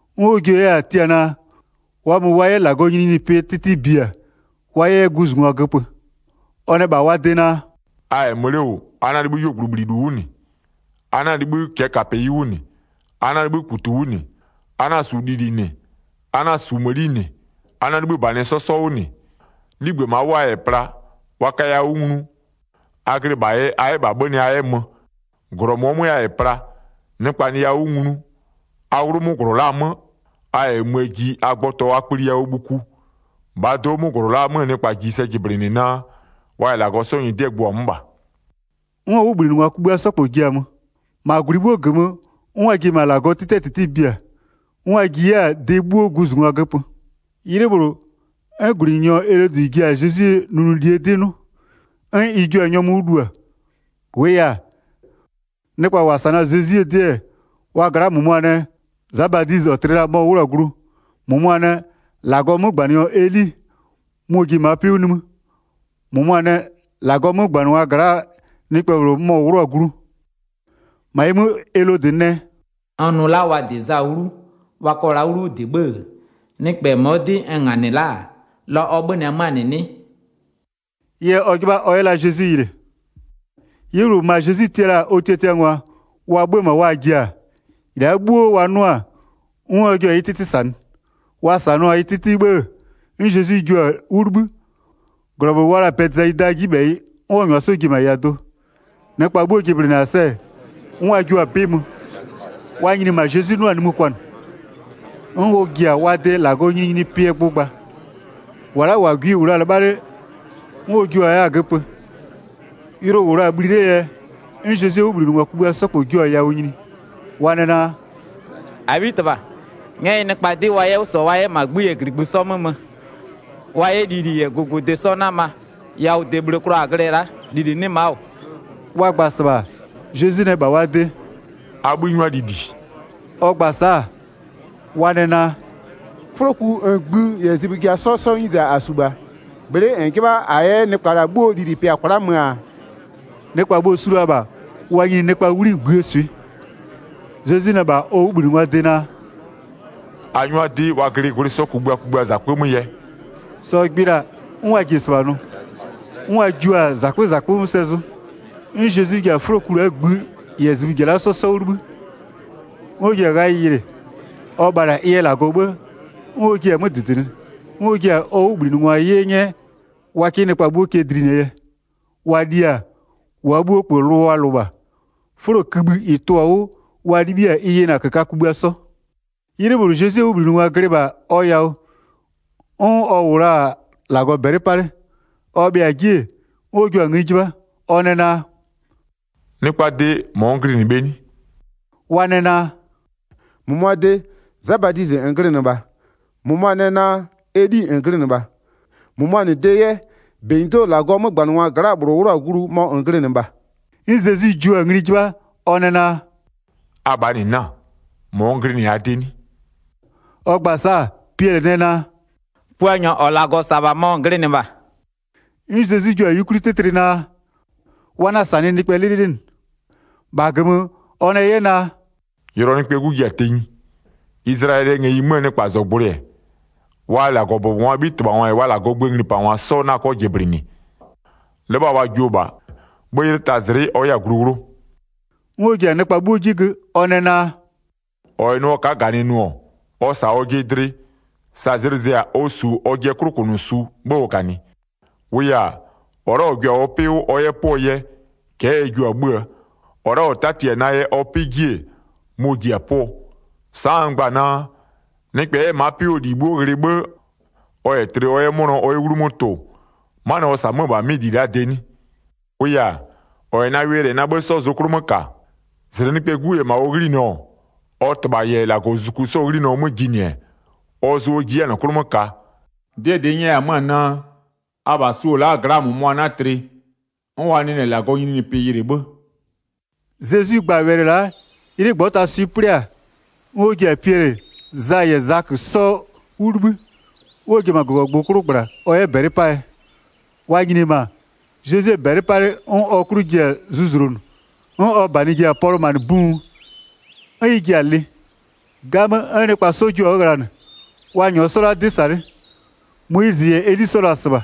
'N ɔ jua 'yɛ-a tia naa, wa mö wa 'yɛ -Lagɔɔ nyininyinipɩɛ 'tɩtɩ bia, wa 'yɛ 'yɛ guzungwa göpö. Ɔ nɛ -bha wa de naa: “A -yɛ mö 'le -wʋ, a 'na-a 'libhï 'yuogblʋbhlilu 'wʋ -nɩ. A 'na-a 'libhï cɛɛkapeyi 'wʋ -nɩ, a 'na-a 'libhï -kputu 'wʋ -nɩ, a 'na-a -su lili -nɩ, a 'na-a -su mëni -nɩ. A 'na-a 'libhï -banɩ 'sɔ 'sɔ 'wʋ -nɩ. 'Ligbë -maa 'wʋ a -yɛ pla, wa kaya 'wʋ nglu, a glɩ -bha yɛ, a 'yɛ -bha 'bhönɩ a 'yɛ mö. 5-Glɔ -mʋɔ 'mö a -yɛ pla, nɩkpa nɩya 'wʋ nglu, a 'wlʋ 'mʋ -glɔ la'a 'mö, a -yɛ möö ji a gbɔtɔ a kpli yawʋɔ bhuku. -Bhaa do'o 'mʋ -glɔ la'a 'möö nɩkpa ji sɛ jɩblɩnɩ naa, wa -yɛ -Lagɔ 'sɔɔ nyɩdɩɛ gbʋ-a 'mö -bha.” 'N ɔ 'wʋbhlinɩngwa kugbïa 'sɔ -kpɔ ji-a mö. -Ma -gwlɩ 'bhuo -gömö 'n wa ji-e -ma -Lagɔɔ 'tɩtɩɛ -tɩtɩ bia, 'n wa ji 'yɛ-a de 'bhuo guzungwa göpö. 'Ylɩ -bhlʋ, 'n -gwlɩnyininyɔ Elodɩ ji-a Zezwie nʋnʋlie 'dɩ 'nʋ, 'n ɩ jio-a nyɔmʋ 'wʋ lua. -Wʋʋ yɛ-a, nɩkpa -wa -sanɩɔ-a Zezwie 'dɩ, wa gla'aa -mʋmʋa nɛ: Za Badizɩ -ɔ tlɩ la-a mɔ-ɔ 'wlʋ-a glu. 8-Mʋmʋa nɛ, -Lagɔɔ 'mögbanɩnyɔ Eli, mɔ-ɔ ji-e ma'a 'pɩ 'wʋ nimï, -mʋmʋa nɛ: -Lagɔɔ 'mögbanɩngwa gla'aa nɩkpɛ -bhlʋ mɔ-ɔ 'wlʋ-a glu. 9-Ma ɩ 'mö Elodɩ nɛ: “N nʋ la'a wa -dɩ Za 'wlu 'wʋ, wa kɔ la'a 'wlu 'wʋ -dɩ 'bhë-ë, nɩkpɛ -mɔɔ 'dɩ n -nganɩ-ɛ la'a, la ɔ 'bhönɩ-ɛ 'mö-a -nɩ 'nɩ?” Ɩ yɛ ɔ 'jɩbha ɔ 'yɛ la Zezwi yɩlɩ. 'Ylɩ -bhlʋ, ma Zezwi tia la-a ɔ tiatiangwa wa 'bhö-ö -ma wa ji-a, -ɩ la'a 'bhuo wa nʋ-a, 'n wa jio-a ɩ 'tɩtɩ -sanɩ. Wa -sanɩɔ-a 'tɩtɩ 'bhë-ë, 'n Zezwi jua-a 'wʋ 'libhï, -glɔ -bhlʋ wa la-a Bɛtɩsayidaa 'jibhɛyɩ, 'n ɔ -nyʋa ji-e -ma yawʋ do. Nɩkpa 'bhuo jɩblɩnɩ-a sɛ, 'n wa jio-a 'bɩ mö. Wa nyini-e -ma, Zezwi 'nʋa-a nimï kwanɩ. 'N ɔ ji-a wa de -Lagɔɔ nyininyinipɩɛ gbʋ gba. -Wa la'a -wa gwi -wʋ la-a 'lɩbha 'le 'n ɔ jua 'yɛ-a göpö. Ylʋ -wʋ la-a bhli 'lee yɛ, 'n Zezwie 'wʋbhlinɩngwa kugbïa 'sɔ -kpɔ jio-a yawʋ nyini, wa nɛ naa: “-Abhitɩbha, 'nyɛ yɩ nɩkpa 'dɩ wa 'yɛ 'wʋ -sɔ wa 'yɛ -ma 'gbï -yɛ -gligbï 'sɔɔ 'mö mö, wa 'yɛ lili -yɛ gʋgʋde 'sɔ 'nama, yawʋdobhle klʋ -a glɩ-ɛ la'a, lili 'nɩ ma'a -wʋ.” Wa gba-a -sɩbha, Zezwi nɛ -bha wa de: “A 'bhï 'nyʋa lili.” Ɔ gba-a sa'a, wa nɛ naa: “'Fʋloku -ngbï -yɛ zibhï ja 'sɔ 'sɔɔ 'nyize -a -su -bha, bhlɩ'ɩ -n 'jɩbha -a 'yɛ nɩkpa -la 'bhuoo lili -pɩa kwla'a mö-a?” Nɩkpa bhuo-o su la-a -bha wa nyini nɩkpaa 'wli -ngbïë swɩ. Zezwi nɛ -bha ɔ 'wʋbhlinɩngwaa de naa: “A 'nyʋa 'dɩ wa glɩ gwlɩ 'sɔ kugbïa kugbïaa -zakpö 'mö yɛ.” Sa ɔ gbɩ la-a 'n wa ji-e -sɩbha nʋ, 'n wa jua-a -zakpö -zakpö 'mö sɛ zʋ. 'N Zezwi ji-a 'fʋloku la'a -ngbï -yɛ zibhï ja la'a 'sɔ 'sɔ 'wʋ 'libhï, 'n ɔ ji-a ghayɩ yɩlɩ, ɔ bhalɩ-a ɩ yɛ -Lagɔ 'bhë, 'n ɔ jiɩ-a 'mö -dɩdɩnɩ, 'n ɔ jiɩ-a ɔ 'wʋbhlinɩngwa 'ye 'nyɛ wa 'kɩ nɩkpa 'bhuo cɛ dlinɩɛ yɛ. Wa li-a, wa 'bhuo -kpö lʋ wa lʋ -bha. 'Fʋlokïbhï -ɩ tʋ-a 'wʋ wa 'libhiɩ-a ɩ yena -köka kugbïa 'sɔ. 'Ylɩ -bhlʋ, Zezwie 'wʋbhlinɩngwa glɩ -bha ɔ yawʋ, 'n ɔ -wʋ la-a -Lagɔ -bɛlɩ 'pa 'le. Ɔ bhɩa-a 'ji, 'n ɔ jua-a ngli 'jɩbha. Ɔ nɛ naa: “Nɩkpaa de, -mɔ n glɩnɩ bhe 'nɩ?” Wa nɛ naa: “-Mʋmʋaa de, Za Badizɩ -n glɩnɩ -bha, -mʋmʋa nɛ naa: Eli -n glɩnɩ -bha, -mʋmʋaa -nɩ de 'yɛ, -benyido'oo -Lagɔɔ 'mögbanɩngwa gla'aa -bhlʋ 'wlʋ-a glu, mɔ -n glɩnɩ -bha.” 'N Zezwi jua-a ngli 'jɩbha, ɔ nɛ naa: “Abhaa -nɩ 'na-a? -Mɔ n glɩnɩ-a a de 'nɩ?” Ɔ gba-a sa'a, Piɛlɩ nɛ naa: “ Puanyɔ -ɔ -Lagɔ -sa-a -bha mɔ -n glɩnɩ -bha.” 'N Zezwi jua-a 'yukwlie 'tɩtlɩ naa, wa 'na-a -sanɩɩ nɩkpɛ 'lɩlɩlɩ -nɩ. 22-Bha -gömö ɔ nɛ 'yɛ naa: “Yʋlɔ Nɩkpɛɛ 'Gu ji-a tenyi, Izlayɛlɩɛ ngëyi 'möö nɩkpazɔgblʋɩ-ɛ, wa -Lagɔbʋbɔngwaa 'bhitɩbhangwa -yɛ -Lagɔɔ gböö nglipangwa 'sɔ 'na 'kɔ jɩblɩnɩ, 'lɩbha wa jio -bha, 'bhë 'ylɩ taa zlɩ ɔ 'yɛ-a glu 'wlʋ.” 'N ɔ ji-a nɩkpa 'bhuo 'ji gö, ɔ nɛ naa: “-Ɔ -yɛ nʋ ɔ ka'a -ganɩ nʋ-ɔ, ɔ -sa ɔjɩ dlɩ, sa zlɩ zɩ-a ɔ -su ɔjɩɛ 'klʋkʋnʋsu, 'bhë ɔ -ganɩ'ɩ. 24-Wʋʋ yɛ-a, -ɔ la'a -ɔ gwɩ-a ɔ 'pɩ 'wʋ ɔ 'yɛ 'pʋɔ yɛ, cɛ'ɛ ɛ jio-a 'bhö-öö, -ɔ la'a -ɔ tati-a na yɛ ɔ 'pɩ ji-e, mɔ-ɔ ji-a 'pʋɔ. Sa'a n gba-a naa: Nɩkpɛ 'yɛ ma'a 'pɩ 'wʋɔ -li 'bhuo ghlɩ 'bhë, ɔ -yɛ tlɩ ɔ 'yɛ 'mʋnɔ ɔ 'yɛ 'yɛ 'wlumö tʋ-ʋ, 'manɩ ɔ -sa-a 'mö-ö -bha 'mɩ -li la'aa de 'nɩ? 26-Wʋʋ yɛ-a, -ɔ -yɛ na wɛlɩ -yɛ na 'bhë 'sɔɔ zʋ 'klʋ 'mö -ka, -zlɩ Nɩkpɛɛ 'Gu -yɛ -ma ɔ 'ghlinɔ-ɔ, ɔ -Tɩbha -yɛ ɔ -Lagɔzuzuku 'sɔɔ 'ghlinɔ 'mö jinɩ-ɛ, ɔ zʋ ɔ ji 'yɛ-a -nɩ 'klʋ 'mö -kaa. 'Dɩɛ -dɩ n nyɛya 'mö-a naa: Abha su-o la'aa gla'aa -mʋmʋa 'na tlɩ, 'n wa nɩ -lɛ -Lagɔɔ nyininyinipɩ yɩlɩ 'bhë.” Zezwi gba-a wɛlɩ la'a, 'ylɩ -ngbɔtaa swɩ 'plɩ-a, 'n ɔ ji-a Piɛlɩ, Za -yɛ Zakö 'sɔ 'wʋ 'libhï, 'n ɔ ji-e -ma -gɔgɔgbʋ 'klʋ -gbla, ɔ 'yɛ -bɛlɩ 'paa yɛ. Wa nyini-e -ma, Zezwi-e -bɛlɩ 'pa 'le, 'n ɔ 'klʋ ji-a zuzlonʋ, 'n ɔ -banɩ ji-a pɔlʋmanɩ buun, 'n ɩ ji-a lɩ. 'Gamö, 'n nɩkpa 'sɔ jio-a 'wʋ ghlanɩ, wa -nyɔɔ 'sɔ-ɔ la'a 'dɩ -sa 'le. Moyizɩ -yɛ Eli sɔ la-a -sɩbha.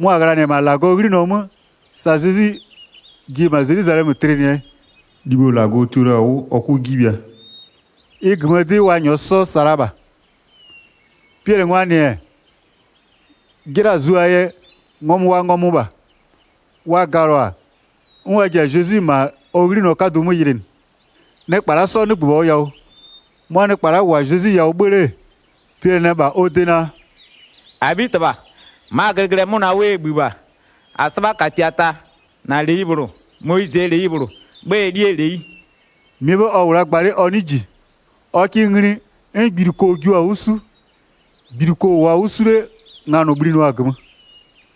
Mʋa-a ghlanɩ-ɛ -ma -Lagɔɔ 'ghlinɔ 'mö, sa Zezwi ji-e -ma Zelwizalɛmö tlɩnɩɛ, libho -Lagɔ tio la-a 'wʋ ɔ 'kʋ 'ji bhɩa, ɩ -gömöö 'dɩ wa -nyɔɔ 'sɔ -sa-a -bha. Piɛlɩngwaa -nɩ-ɛ, 'jɩla zua-aa yɛ, ngɔmö wa ngɔmö -bha. Wa galɔ-a, 'n wa ji-a Zezwi -ma ɔ 'ghlinɔ 'kadʋ 'mö yɩlɩnɩ, nɩkpa la'a 'sɔ 'nɩgbö -bha ɔ yawʋ. 'Mʋa nɩkpa la'a -wʋ-a Zezwi yawʋ 'bhö-ö 'le, Piɛlɩ nɛ -bha ɔ de naa: “-Abhitɩbha, ma'aa glɩglɩɛ 'mʋna 'wʋ ɛ -bhï -bha, -a 'sɩbha -katia ta, -na -leyi -bhlʋ, Moyizɩɛ -leyi -bhlʋ, 'bhë Elie -leyi.” -Mɩɛ 'bhë ɔ -wʋ la gba 'le ɔ 'nɩɩ -ji. Ɔ kɩ ngli, 'n gbiluko jua-a 'wʋ 'su, gbiluko -wʋʋa-a 'wʋ 'su 'le nganɔ bhlinʋa-a -gömö.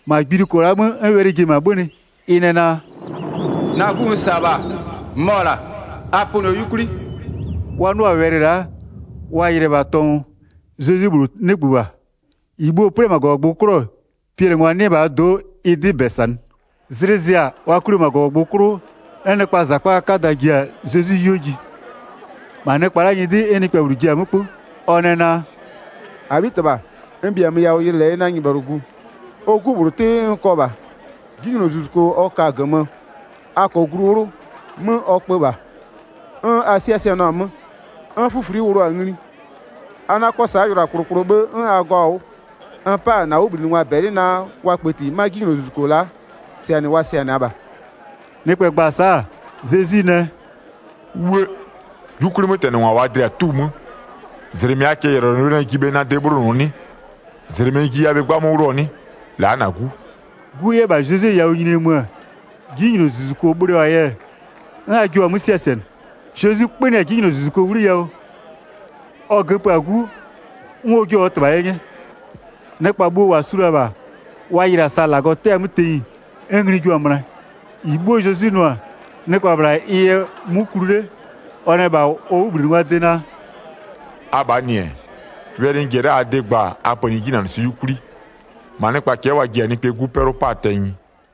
35-Ma gbiluko la'aa 'mö 'n wɛlɩ ji-e -ma 'bhönɩ, ɩ nɛ naa: “Na 'Gu n -sa-a -bha mɔ-ɔ -la, a pönɩɔ 'yukwli.” Wa 'nʋ-a wɛlɩ la'a, wa yɩlɩ-ɛ -bha tɔngʋ, Zezwi -bhlʋ 'nɩgbö -bha. -Ɩ bhuo-o 'plɩ-ɛ -ma -gɔgɔgbʋ 'klʋ, Piɛlɩngwa 'nɩ-ɛ -bhaa do'o ɩ 'dɩ -bɛ -sanɩ. Zlɩ zɩ-a, wa kwli-e -ma -gɔgɔgbʋ 'klʋ, 'n nɩkpaa -zakpaa 'kada ji-a Zezwi 'yuo ji. 38-Ma nɩkpa la'aa nyɩdɩ 'n nɩkpɛ -bhlʋ ji-a 'mö 'kpö, ɔ nɛ naa: “-Abhitɩbha, n -bhiamö yawʋ, yɩlɩ -lɛ yɩ na nyɩbhɛlʋgu, ɔ 'gu -bhlʋ 'tɩ 'n n kɔ -bha. 'Jinylozuzuko ɔ ka-a -gömö. A -kɔɔ glu 'wlʋ, 'mö ɔ kpö -bha, 'n a 'siasianɩɔ-a 'mö, 'n 'fïfli'i wlʋɔ-a ngli. A 'na 'kɔ sa'a yʋlʋa kplokplo 'bhë 'n a gɔ-a 'wʋ. N 'pa-a -na 'wʋbhlinɩngwa -bɛlɩ naa, wa kpëti 'ma 'jinylozuzuko la'a, sɩanɩ wa sɩanɩa -bha.” Nɩkpɛ gba-a sa'a, Zezwi nɛ: “'Wuë! 'Yukwlimötɛnɩngwa -waa dlɩa-a 'tu-u 'mö, -zlɩmɩ a cɛyʋlɔnʋyʋlɔnʋɛ ji bhe na de 'bhlonʋɔ 'nɩ? -Zlɩmɩ n jiya-a 'gbamö 'wlʋɔ 'nɩ? La'a -na 'gu.” 'Gu 'yɛ -bha Zezwi yawʋ nyinie mö-ö, 'jinylozuzuko bhlɩɔ-a yɛ, 'n a jio-a 'mö 'siasianɩ. Zezwi 'kpönɩ-a 'jinylozuzuko 'wliyawʋ, ɔ göpö-a 'gu, 'n ɔ jio-a ɔ -tɩbha 'ye 'nyɛ. Nɩkpa bhuo -wa su la-a -bha, wa yɩlɩ-a sa -Lagɔ 'tɛ-a 'mö tenyi, 'n ngli jua-a möna. -Ɩ 'bhuo Zezwi nʋ-a, nɩkpa-a -bhla ɩ yɛ 'mö klu 'le, ɔ nɛ -bha ɔ 'wʋbhlinɩngwaa de naa: “Abhaa -nɩ-ɛ, wɛlɩ n ji-e la'a a de gba-a, a pönɩɩ 'jinanɩswɩ'ɩ 'yukwli, -ma nɩkpa cɛ'ɛ wa ji-a Nɩkpɛɛ 'Gu 'pɛlʋ 'paa tɛnyɩ.”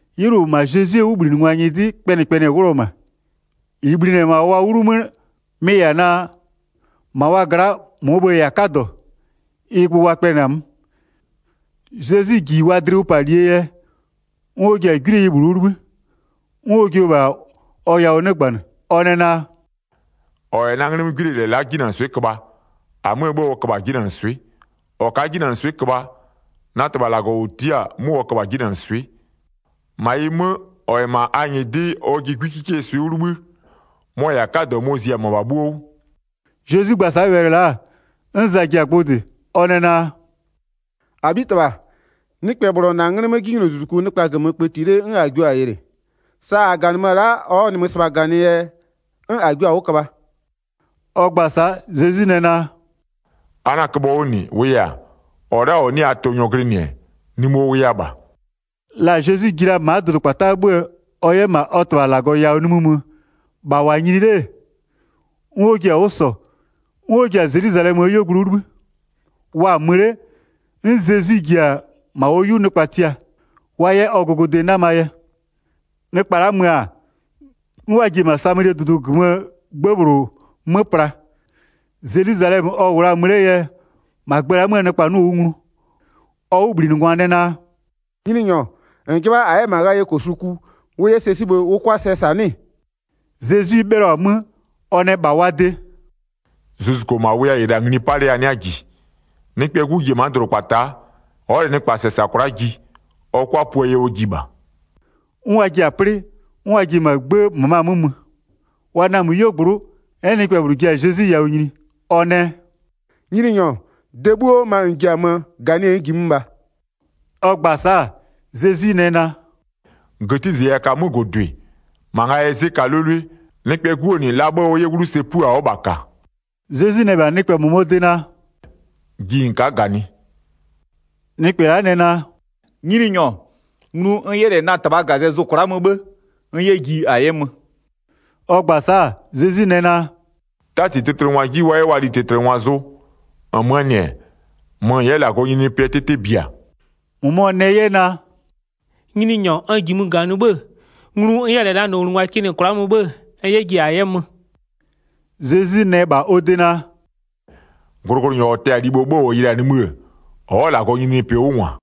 'Ylɩ -bhlʋ, -ma Zezwie 'wʋbhlinɩngwa nyɩdɩ kpɛnɩkpɛnɩɛ-ɛ 'wlʋ-ɔ -ma. -Ɩ bhlinɩ-ɛ -ma wa 'wlu 'mö mɩ-ɩ -yɛ-a naa: -Ma wa gla'a -mɔɔ bhë-ë -yɛ-a 'kadɔ, ɩ gbʋ wa kpɛnɩ-a 'mö. Zezwi -ji wa dlɩwʋpalie yɛ, 'n ɔ ji-a 'gwileyi -bhlʋ 'wʋ 'libhï, 'n ɔ jio-o -bha ɔ yawʋ 'nɩgbanɩ. Ɔ nɛ naa: “-Ɔ -yɛ na 'nglɩ 'mö 'gwileyi -lɛ la'a 'jinanɩswɩ'ɩ köbha, -amöö 'bhë ɔ köbha-a 'jinanɩswɩ'ɩ. -Ɔ ka'a 'jinanɩswɩ'ɩ köbha, na -Tɩbha -Lagɔ -ʋ tia'a-a, 'mʋ ɔ köbha 'yɛ-a 'jinanɩswɩ'ɩ. -Ma ɩ 'mö, -ɔ -yɛ -ma a nyɩdɩ ɔjɩ 'gwikikeyie swɩ'ɩ 'wʋ 'libhï, mɔ-ɔ -yɛ-a 'kadɔ mɔ-ɔ zi-a -mʋabha 'bhuo 'wʋ.” Zezwi gba-a sa'a wɛlɩ la'a, 'n Za ji-a gbʋ -dɩ, ɔ nɛ naa: “-Abhitɩbha, nɩkpɛ -bhlʋ-ɔ -na 'nglɩ 'mö 'jinylozuzuku nɩkpa -gömö kpëti 'le, 'n -a jio-a yɩlɩ. Sa -a -ganɩmö-ö la'a ɔ -nɩmö -sɩbha -ganɩɛ yɛ, 'n -a jio-a 'wʋ köbha.” Ɔ gba-a sa'a Zezwi nɛ naa: “A 'na-a köbhɔ 'wʋ -nɩ. -Wʋʋ yɛ-a, -ɔ la'a -ɔ nɩ a tʋnyɔ glɩnɩ-ɛ, nimï ɔ wʋya -bha.” La Zezwi ji la-a ma'a dʋdʋkpata'a 'bhö-ö ɔ 'yɛ -ma ɔ -Tɩbha -Lagɔ yawʋ nimï mö, -bha -wʋ-a nyini 'le-e, 'n ɔ ji-a 'wʋ -sɔ, 'n ɔ ji-a Zelwizalɛmöö 'yuogblʋ 'wʋ 'libhï. Wa-a mö 'le, 'n Zezwi ji-e -ma ɔ 'yu nɩkpa tia, wa 'yɛ ɔ gʋgʋde 'namaa yɛ. Nɩkpa la'a mö-a, 'n wa ji-e -ma Samalie dʋdʋ -gömöö 'gbë -bhlʋ 'mö pla. Zelwizalɛmö ɔ -wʋ-a mö 'lee yɛ, -ma gbë la'a 'möö nɩkpa 'nɩɔ-ɔ 'wʋ nglu. Ɔ 'wʋbhlinɩngwa nɛ naa: “Nyininyɔ, -n 'jɩbha -a 'yɛ -ma ghayɩɛ -kosu ku, ʋ 'yɛ sɛ 'sibhë ʋ 'kʋa sɛ -sa 'nɩ-ɩ?” Zezwi 'bhɩlɔ-a 'mö, ɔ nɛ -bha wa de: “Zuzuko -ma wʋya-a -ɩ -la ngli 'pa 'le a 'nɩa -ji. Nɩkpɛɛ 'Gu ji-e ma'a dʋdʋkpata'a, ɔ'ɔ -lɛ nɩkpa sɛ -sa kwla'a ji, ɔ 'kʋa puaa yɛ ɔ ji -bha.” 'N wa ji-a 'plɩ, 'n wa ji-e -ma gbë -mömaa 'mö mö. Wa namö 'yuogblʋ'ʋ, 'n nɩkpɛ -bhlʋ ji-a Zezwi yawʋ nyini, ɔ nɛ: “Nyininyɔ, de 'bhuo -ma -n ji-a möö -ganɩɛ n -jimö -bha.” Ɔ gba-a sa'a, Zezwi nɛ naa: “-Gëtizleyia ka 'mögʋdʋɩ, -ma ghayɩɛ 'zɩ ka 'lʋlʋɩ, Nɩkpɛɛ 'Guo -nɩ la 'bhë ɔ 'yɛ 'wlu sɛ 'pua ɔ'ɔ -bha -ka.” Zezwi nɛ -bha nɩkpɛ -mʋmɔɔ de naa: “Ji -n ka'a -ganɩ.” Nɩkpɛ la'a nɛ naa: “Nyininyɔ, nglu n 'yɛ -lɛ na -tɩbhaa -gazɛ zʋ kwla'a mö 'bhë, n 'yɛ ji -a 'yɛ mö.” Ɔ gba-a sa'a, Zezwi nɛ naa: “'Tati tlɩtlɩngwa 'ji wa 'yɛ wa litlɩtlɩngwa zʋ. -Nmöö -nɩ-ɛ, mö -n 'yɛ -Lagɔɔ nyininyinipɩɛ 'tɩtɩ bia.” 61-Mʋmɔ nɛ 'yɛ naa: “Nyininyɔ n -jimö -ganɩ 'bhë-ë, nglu n 'yɛ -lɛ na -lowlengwa kɩnɩ kwla'a mö 'bhë n 'yɛ ji -a 'yɛ mö.” Zezwi nɛ -bha ɔ de naa: “Glʋglʋnyɔ -ɔ tɛɛ-a libho 'bhë -ɔ yɩlɩ-a nimï-ë, ɔ'ɔ -Lagɔɔ nyininyinipɩ 'wʋ -ngwa.”